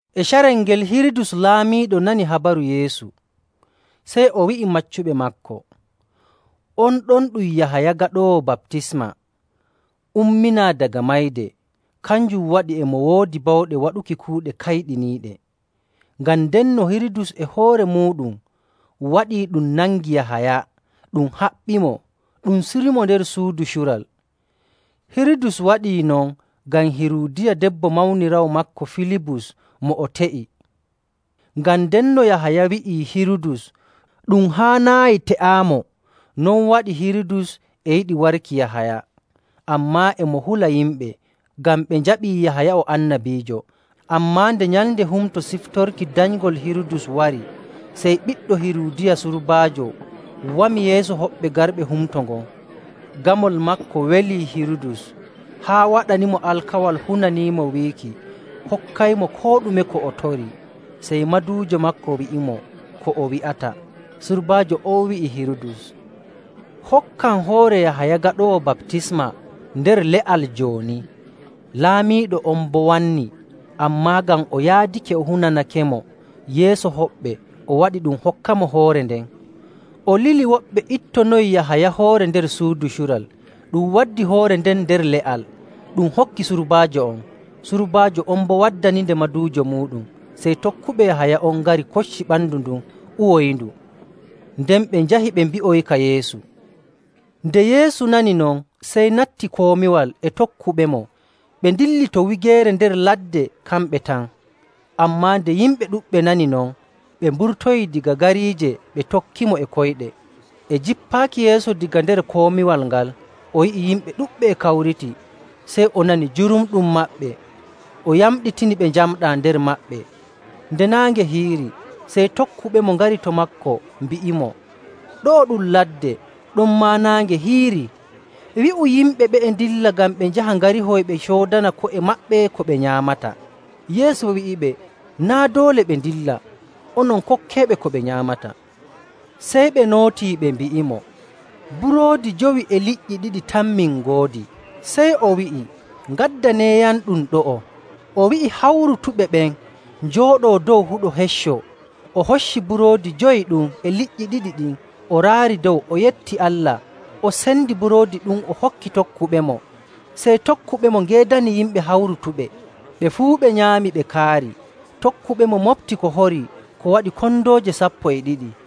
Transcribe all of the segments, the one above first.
E carel ngel Hirudus Laamiiɗo nani habaru Yeesu. Sey o wi'i maccuɓe maako, “On ɗon ɗum Yahaya Gaɗoowo Baptisma umminaa daga mayde, kanjum waɗi e mo woodi bawɗe waɗuki kuuɗe kayɗiniiɗe.” Ngam ndenno Hirudus e hoore muuɗum waɗii ɗum nangii Yahaya, ɗum haɓɓimo, ɗum surimo nder suudu cural. Hirudus waɗi non ngam Hiruudiya debbo mawniraawo maako Filibus mo o te'i. Ngam ndenno Yahaya wi'ii Hirudus, “Ɗum haanaayi te'aamo.”.. Non waɗi Hirudus e yiɗi warki Yahaya, ammaa e mo hula yimɓe, ngam ɓe njaɓii Yahaya o annabiijo. Ammaa nde nyalnde humto siftorki danyngol Hirudus wari, sey ɓiɗɗo Hiruudiya surbaajo wami yeeso hoɓɓe garɓe humto ngon. Gamol maako welii Hirudus, haa waɗanimo alkawal hunaniimo wiiki hokkaymo koo ɗume ko o torii. Sey maduujo maako wi'imo ko o wi'ata. Surbaajo on wi'i Hirudus, “Hokkam hoore Yahaya Gaɗoowo Baptisma nder le'al jooni.” Laamiiɗo on boo wanni, ammaa ngam o yaadake o hunanakemo yeeso hoɓɓe, o waɗi ɗum hokkamo hoore nden. O lili woɓɓe ittonoyi Yahaya hoore nder suudu cural. Ɗum waddi hoore nden nder le'al, ɗum hokki surbaajo on. Surbaajo on boo waddaninde maduujo muuɗum. Sey tokkuɓe Yahaya on ngari kocci ɓandu ndun uwoyindu. Nden ɓe njahi ɓe mbi'oyika Yeesu. Nde Yeesu nani non, sey natti komiwal e tokkuɓemo ɓe ndilli to wigeere nder ladde kamɓe tan. Ammaa nde yimɓe ɗuɗɓe nani non, ɓe mburtoyii daga gariije, ɓe tokkimo e koyɗe. E jippaaki Yeesu daga nder komiwal ngal o yi'i yimɓe ɗuɗɓe e kawriti, sey o nani jurumɗum maɓɓe, o yamɗitini ɓe njamɗaa nder maɓɓe. Nde naange hiirii, sey tokkuɓemo ngari to maako, mbi'imo, “Ɗo'o ɗum ladde, ɗonmaa naange hiiri. Wi'u yimɓe ɓe'e ndilla ngam ɓe njaha ngarihoy ɓe coodana ko'e maɓɓe ko ɓe nyaamata.” Yeesu wi'iɓe, “Naa' doole ɓe ndilla. Onon kokkeeɓe ko ɓe nyaamata.” Sey ɓe nootii ɓe mbi'imo, “Buroodi jowi e liƴƴi ɗiɗi tan min ngoodi.” Sey o wi'i, “Ngaddaneeyamɗum ɗo'o.” O wi'i hawrutuɓe ɓen njooɗoo dow huɗo hecco. O hocci buroodi jowi ɗum e liƴƴi ɗiɗi ɗin, o raari dow, o yetti Allah, o sendi buroodi ɗum o hokki tokkuɓemo, sey tokkuɓemo ngeedani yimɓe hawrutuɓe. Ɓe fuu ɓe nyaami ɓe kaari. Tokkuɓemo moɓti ko hori ko waɗi kondooje sappo e ɗiɗi.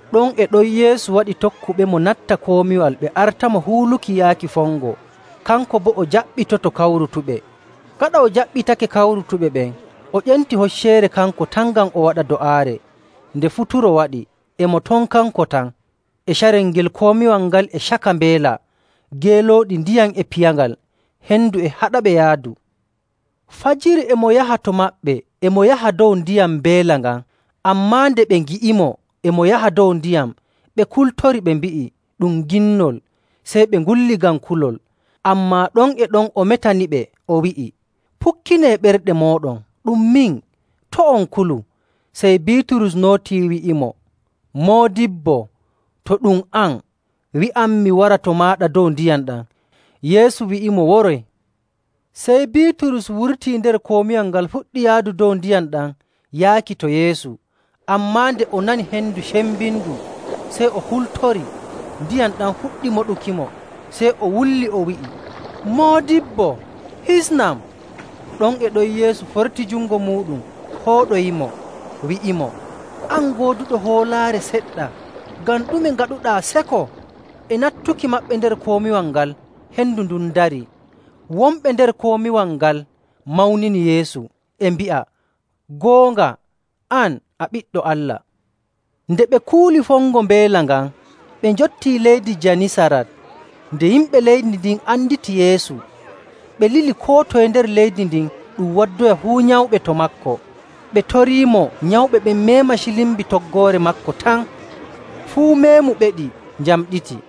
Ɗon e ɗon Yeesu waɗi tokkuɓemo natta komiwal ɓe artamo huuluki yaaki fongo, kanko boo o jaɓɓitoto kawrutuɓe. Gaɗa o jaɓɓitake hawrutuɓe ɓen, o ƴenti hocceere kanko tan ngam o waɗa do'aare. Nde futuro waɗi, e mo ton kanko tan. E carel ngel komiwal ngal e caka mbeela. Geelooɗi ndiyam e piyangal, hendu e haɗaɓe yaadu. Fajiri e mo yaha to maɓɓe, e mo yaha dow ndiyam mbeela ngan. Ammaa nde ɓe ngi'imo e mo yaha dow ndiyam, ɓe kultori, ɓe mbi'i, “Ɗum ginnol!” Sey ɓe ngulli ngam kulol. Ammaa ɗon e ɗon o metaniɓe, o wi'i, “Pukkinee ɓerɗe mooɗon, ɗum min. To' on kulu.” Sey Biiturus nootii, wi'imo, “Moodibbo, to ɗum an, wi'am mi wara to maaɗa dow ndiyam ɗam.” Yeesu wi'imo, “Woroy.” Sey Biiturus wurtii nder komiwal ngal fuɗɗi yaadu dow ndiyam ɗam yaaki to Yeesu. Ammaa nde o nani hendu cembindu, sey o hultori, ndiyam ɗam fuɗɗi moɗukimo, sey o wulli, o wi'i, “Moodibbo, hisnam!” Ɗon e ɗon Yeesu forti jungo muuɗum fooɗoyimo, wi'imo, “An gooduɗo hoolaare seɗɗa, ngam ɗume ngaɗuɗaa seko?” E nattuki maɓɓe nder komiwal ngal, hendu ndun darii. Wonɓe nder komiwal ngal mawnini Yeesu, e mbi'a, “Goonga, an a Ɓiɗɗo Allah.” Nde ɓe kuuli fongo mbeela ngan, ɓe njottii leydi Janisarat. Nde yimɓe leydi ndin anditi Yeesu, ɓe lili koo toye nder leydi ndin ɗum waddoya fuu nyawɓe to maako. Ɓe toriimo nyawɓe ɓen meema cilmbi toggoore maako tan. Fuu meemuɓeɗi njamɗiti.